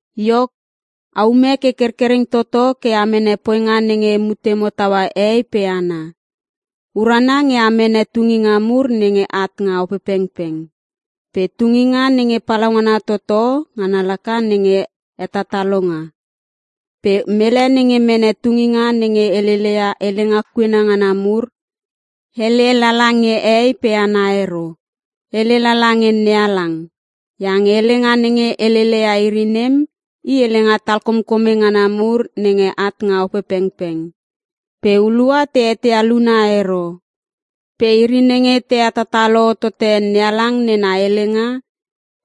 Iok, aume ke kerkereng toto ke a mene poinga nenge mutemo taua hehei pe hana. Urana nge a mene tunginga mur nenge at nga Opepengpeng. Pe tunginga nenge palaungana toto ngana laka nenge hetatalonga. Pe mele nenge mene tunginga nenge helele ia helenga kuena ngana mur, hele lala nge hehei pe hana ero, hele lala nge NeHalang. Iange helenga nenge helele ia iri nem i helenga talkomkome ngana mur nenge at nga Opepengpeng pe hulua te eteia luna ero. Pe iri nenge te hetatalo hotote NeHalang nena helenga,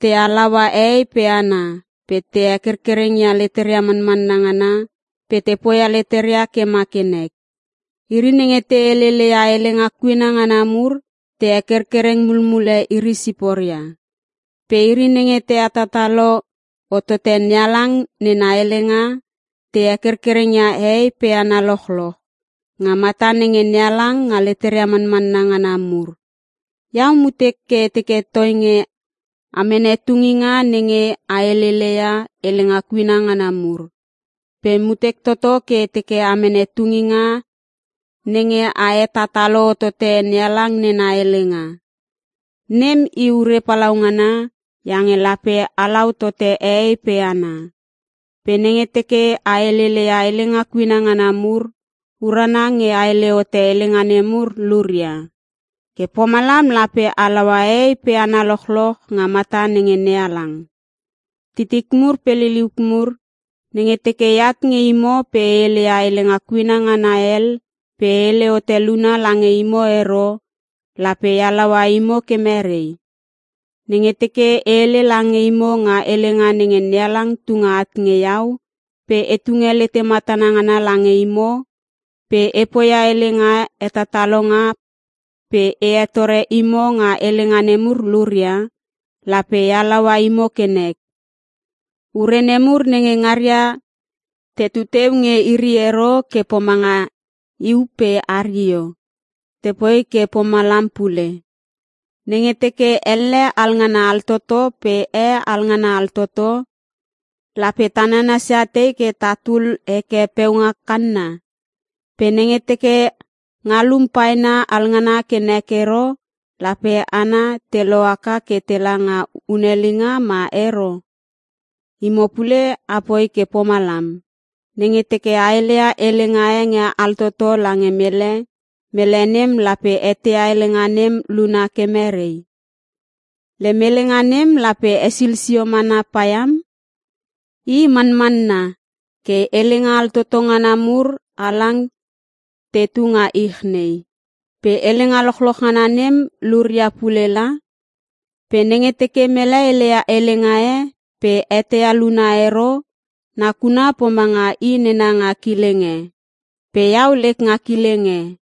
te halaua hehei pe hana pe te hekerkereng ia leteria manmanna ngana pe te poia leteria ke ma ke nek. Iri nenge te helele ia helenga kuena ngana mur te hekerkereng mulmule iri siporia. Pe iri nenge te hetatalo hotote NeHalang nena helenga te hekerkereng ia hehei pe hana lochloch, nga mata nenge NeHalang nga leteria manmanna ngana mur. Iau mutek ke e teke toinge amene tunginga nenge a helele ia helenga kuena ngana mur. Pe mutek toto ke e teke amene tunginga nenge a hetatalo hotote NeHalang nena helenga. Nem i ure palaungana iange lape halau tote hehei pe hana. Pe nenge teke a helele ia helenga kuena ngana mur, urana nge a hele hote helenga nemur luria. Ke pomalam lape halaua hehei pe hana lochloch nga mata nenge NeHalang. Titik mur pe liliuk mur, nenge teke eat nge imo pe e hele ia helenga kuena ngana hel pe e hele hote luna lange imo ero, lape e halaua imo ke merei? Nenge teke e hele lange imo nga helenga nenge NeHalang tunge at nge iau pe e tunge lete matana ngana lange imo, pe e poia helenga hetatalonga pe e hetore imo nga helenga nemur luria, lape e halaua imo ke nek. Ure nemur nenge ngaria te tuteu nge iri ero ke pomanga iu pe hario, tepoi ke pomalam pule. Nenge teke elle alngana altoto pe e alngana altoto lape ta nanasia tei ke tatul heke peunga kanna? Pe nenge teke ngalum paena alngana ke nek ero, lape hana te lohaka ke tela nga hunelinga ma ero? Imo pule apoi ke pomalam. Nenge teke a heleia helenga e nge altoto lange mele, mele nem lape eteia helenga nem luna ke merei? Lem helenga nem lape hesil sio mana paiam. I manmanna ke helenga altoto ngana mur halang tetu nga ich nei. Pe helenga lochloch ngana nem luria pule la. Pe nenge teke mele heleia helenga e pe e eteia luna ero, nakuna pomanga i nena nga kileng e pe iau lek nga kileng e.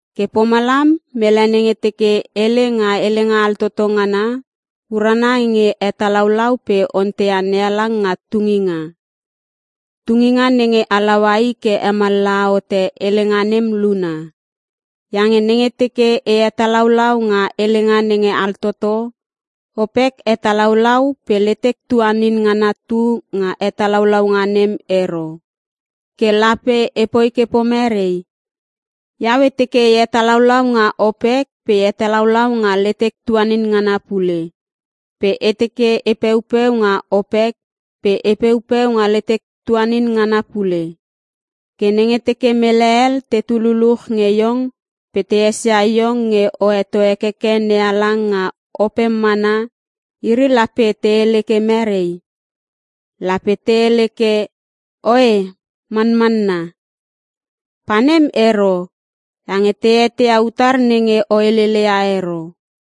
Ke pomalam mele nenge teke hele nga helenga altoto ngana, urana nge hetalaulau pe onteia NeHalang nga tunginga, tunginga nenge halaua i ke hemallaha hote helenga nem luna. Iange nenge teke e hetalaulau nga helenga nenge altoto, opek hetalaulau pe letek tuanin ngana tu nga hetalaulaunga nem ero. Ke lape epoi ke pomerei? Iau e teke e hetalaulau nga opek pe e hetalaulau nga letek tuanin ngana pule. Pe e teke e peupeu nga opek pe e peupeu nga letek tuaninin ngana pule. Ke nenge teke mele hel tetu luluch nge iong pe te esia iong nge o heto hekeke NeHalang nga opem mana, iri lape te hele ke merei? Lape te hele ke, “Oe Manmanna.”? Pa nem ero iange te eteia utar nenge o helele ia ero.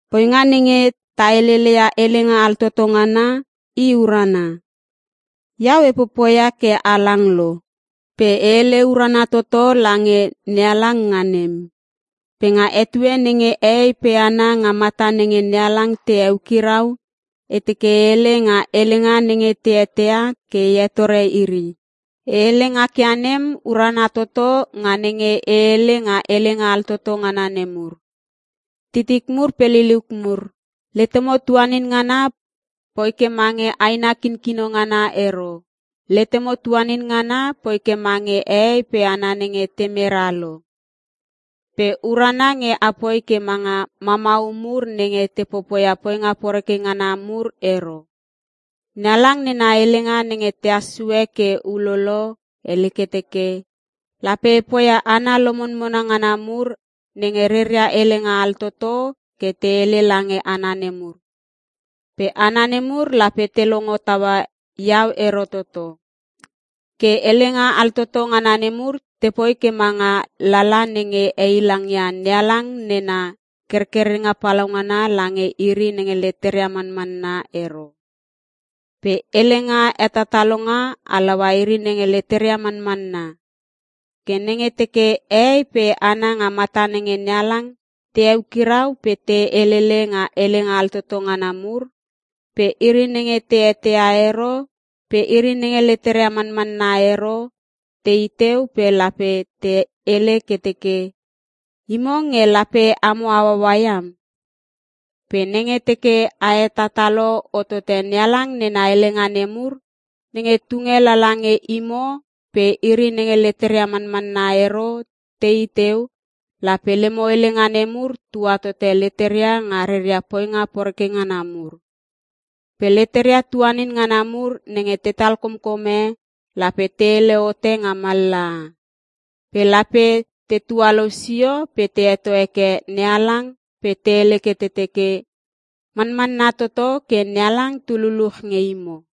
Poinga nenge ta helele ia helenga altoto ngana i urana. Iau e popoia ke halang lo pe e hele urana toto lange NeHalang nga nem. Pe nga etue nenge hehei pe hana nga mata nenge NeHalang te heukirau, e teke e hele nga helenga nenge te eteia ke e hetore iri. E hele ngak ia nem urana toto nga nenge ehele nga helenga altoto ngana nemur. Titik mur pe liliuk mur, letemo tuanin ngana poi ke mange aina kinkino ngana ero. Letemo tuanin ngana poi ke mange hehei pe hana nenge te mera lo. Pe urana nge apoi ke manga mamau mur nenge te popoia poinga poreke ngana mur ero. NeHalang nena helenga nenge tehas sue ke ulolo hele ke teke, “Lape e poia hana lomonmona ngana mur nenge reria helenga altoto ke te hele lange hana nemur, pe hana nemur lape te longo taua iau ero toto.” Ke helenga altoto ngana nemur tepoi ke manga lala nenge heilangia NeHalang nena kerkerenga palaungana lange iri nenge leteria manmanna ero. Pe helenga hetatalonga halaua iri nenge leteria manmanna. Ke nenge teke hehei pe hana nga mata nenge NeHalang te heukirau pe te helele nga helenga altoto ngana mur, pe iri nenge te eteia ero pe iri nenge leteria mamanna ero tei teu pe lape te hele ke teke, “Imo nge lape amo hauhaua iam!” Pe nenge teke a hetatalo hotote NeHalang nena helenga nemur, nenge tunge lala nge imo pe iri nenge leteria manmanna ero tei teu, lape lemo helenga nemur tua tote leteria nga reria poinga poreke ngana mur. Pe leteria tuanin ngana mur nenge tetal komkome lape te hele hote nga mallaha. Pe lape te tualou sio pe te heto heke NeHalang pe te hele ke te teke, “Manmanna toto ke NeHalang tu luchluch nge imo!”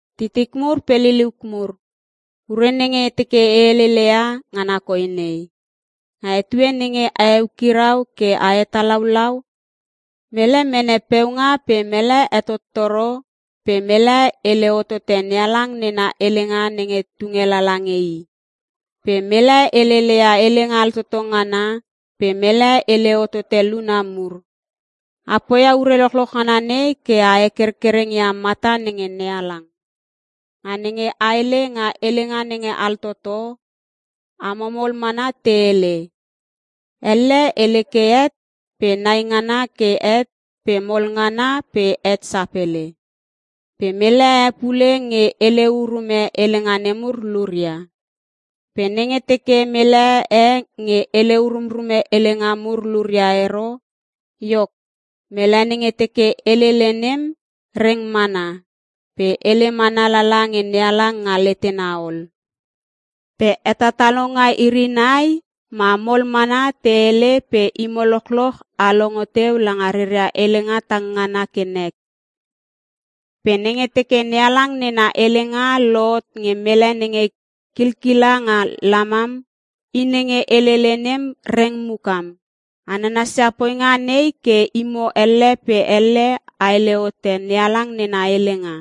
Titik mur pe liliuk mur, ure nenge e teke e helele ia ngana koi nei: Nga etue nenge a eukirau ke a hetalaulau, mele mene peunga pe mele hetottoro pe mele hele hotote NeHalang nena helenga nenge tunge lala nge i, pe mele helele ia helenga altoto ngana pe mele hele hotote luna mur. A poia ure lochloch ngana nei ke a hekerkereng ia mata nenge NeHalang. Nga nenge a hele nga helenga nenge altoto amo mol mana te hele. Elle hele ke het pe nai ngana ke het pe mol ngana pe het sapele. Pe mele e pule nge hele urume helenga nemur luria. Pe nenge teke mele e nge hele urumrume helenga mur luria ero, iok, mele nenge teke helele nem reng mana pe hele mana lala nge NeHalang nga letena ol. Pe hetatalonga iri nai ma mol mana te hele pe imo lochloch a longo teu langa reria helenga tang ngana ke nek. Pe nenge teke NeHalang nena helenga lohot nge mele nenge kilkila nga lamam, i nenge helele nem reng mukam. A nanasia poinga nei ke imo elle pe elle a hele hote NeHalang nena helenga.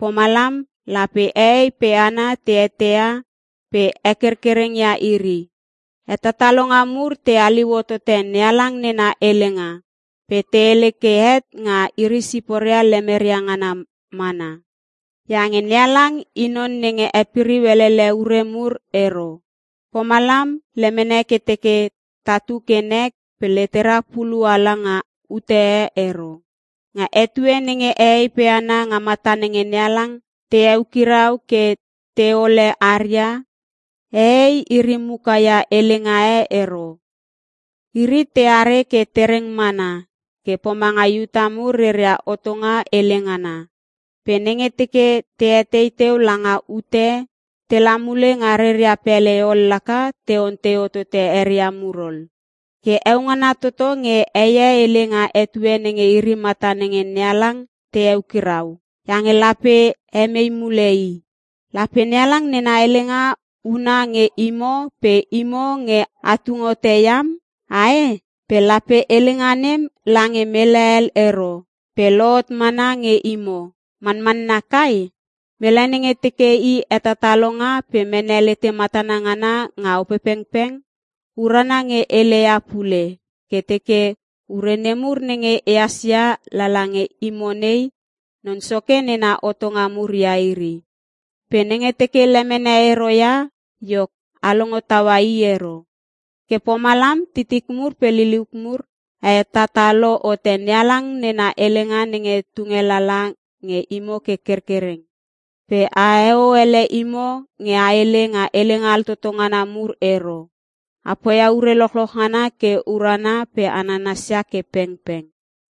Pomalam lape hehei pe hana te eteia pe hekerkereng ia iri. Hetatalonga mur te haliu hotote NeHalang nena helenga pe te hele ke het nga iri siporia lemeria ngana mana. Iange NeHalang i non nenge hepiriu elele ure mur ero. Pomalam lemene ke teke tatu ke nek pe letera pulu ala nga ute e ero. Nga etue nenge hehei pe hana nga mata nenge NeHalang te eukirau ke teole haria, hehei iri muka ia helenga e ero. Iri teare ke tereng mana ke pomanga Iuta mur reria hotonga hele ngana. Pe nenge te teke te etei teu langa ute, tela mule nga reria pele ol laka te ontei hotote eria mur ol. Ke heo ngana toto nge heie hele nga etue nenge iri mata nenge NeHalang te hekirau iange lape hemei mule i. Lape NeHalang nena helenga huna nge imo pe imo nge a tung hote iam ae? Pe lape helenga nem la nge mele hel ero pe lohot mana nge imo, manmanna kai? Mele nenge teke i hetatalonga pe mene lete matana ngana nga Opepengpeng, urana nge heleia pule ke teke ure nemur nenge ehas ia lala nge imo nei, Non Soke nena hotonga mur ia iri. Pe nenge teke lemene ero ia, iok a longo taua i ero. Ke pomalam titik mur pe liliuk mur, a hetatalo hote NeHalang nena helenga nenge tunge lala nge imo ke kerkereng. Pe aheo ele imo nge a hele nga helenga altoto ngana mur ero. A poia ure lochloch ngana ke urana pe a nanasia ke pengpeng.